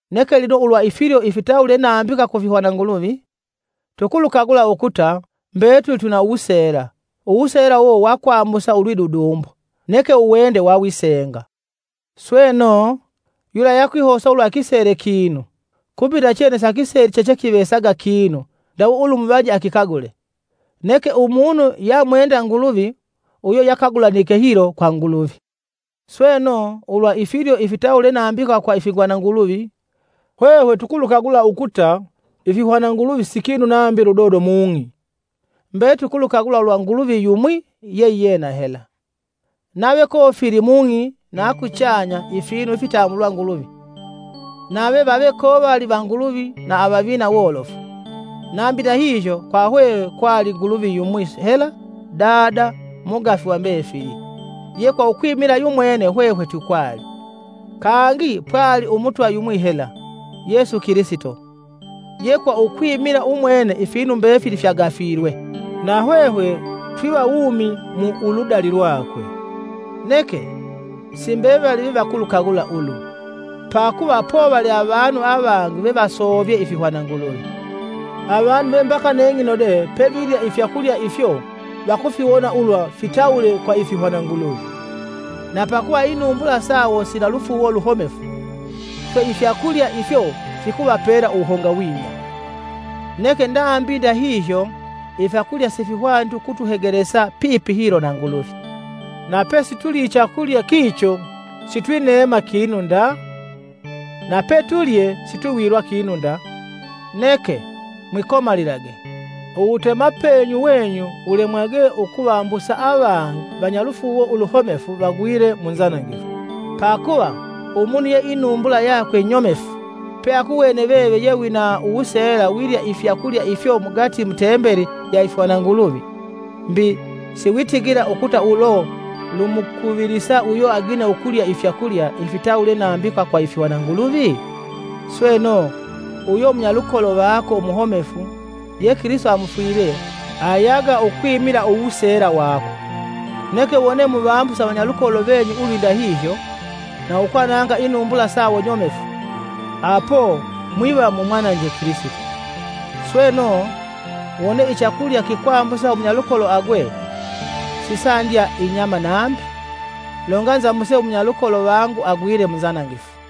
Neke lino ulwa ifilyo ifitawule nambika ku ifihwananguluvi: Tukulukagula ukuta, mbetuli twina wuseela, uwuseela uwo wakwambusa ulwidudumbo neke uwende wawisenga. sweno, yula yakwihosa ulwa akisele kinu, kumbi nachene sakiseli chechekivesaga kinu ndawe ulumuvaje akikagule. Neke umunu yamwenda Nguluvi, uyo yakagulanike hilo kwa Nguluvi. Sweno ulwa ifilyo ifitawule nambika kwa ifihwananguluvi, hwehwe tukulukagula ukuta ifihwananguluvi si kinu nambi ludodo mung'i, mbetuli tukulukagula ulwa Nguluvi yumwi yeiyena hela. Nave kofili mung'i na kuchanya ifinu ifitambulwa nguluvi, nave vave kovali vanguluvi na avavina wolofu, nambi ndahihyo, kwa hwehwe kwali Nguluvi yumwi hela; Dada, mugafi va mbefili, ye kwa ukwimila yumwene hwehwe twikwali. Kangi pwali Umutwa yumwi hela, Yesu Kilisito, ye kwa ukwimila umwene ifinu mbefili fyagafilwe, na hwehwe twiva wumi kwa uludali lwakwe. Neke, si mbevali vevakulukagula ulu. Pakuva povali avanu avangi vevasovyee ifihwananguluvi, avanu ve mbaka neng'ino de pevilya ifyakulya ifyo vakufiwona ulwa fitawule kwa ifihwananguluvi. Na pakuva inumbula sawo sina lufuuwo luhomefu, swe ifyakulya ifyo fikuvapela uwuhongawinya. Neke nambi ndahihyo ifyakulya sifihwaniti ukutuhegelesa pipi hilo na Nguluvi. Na pesitulii ichakulya kicho sitwi neema kinu nda, na petulye sitwiwilwa kinu nda. Neke, mwikomalilage; uwutemapenyu wenyu wulemwage ukuvambusa avangi vanyalufuuwo uluhomefu vagwile mu nzanangifu. Pakuva, umunu ye inumbula yakwe nyomefu, peakuwene veve ye wina uwuseela wilya ifyakulya ifyo mugati mu Tembeli ya ifihwananguluvi, mbi, siwitigila ukuta ulo lumukuvilisa uyo agine ukulya ifyakulya, ifitawule nambika kwa ifihwananguluvi? Sweno, uyo umunyalukolo vako umuhomefu ye Kilisito amufwilye, ayaga ukwimila uwuseela wako. Neke wone muvambuse avanyalukolo venyu ulwindahihyo, na ukwananga inumbula sawo nyomefu, apo mwiva mumwananje Kilisito. Sweno, wone ichakulya kikwambusa umunyalukolo agwe, sisandya inyama nambi, longa nzambuse umunyalukolo vangu agwile munzanangifu.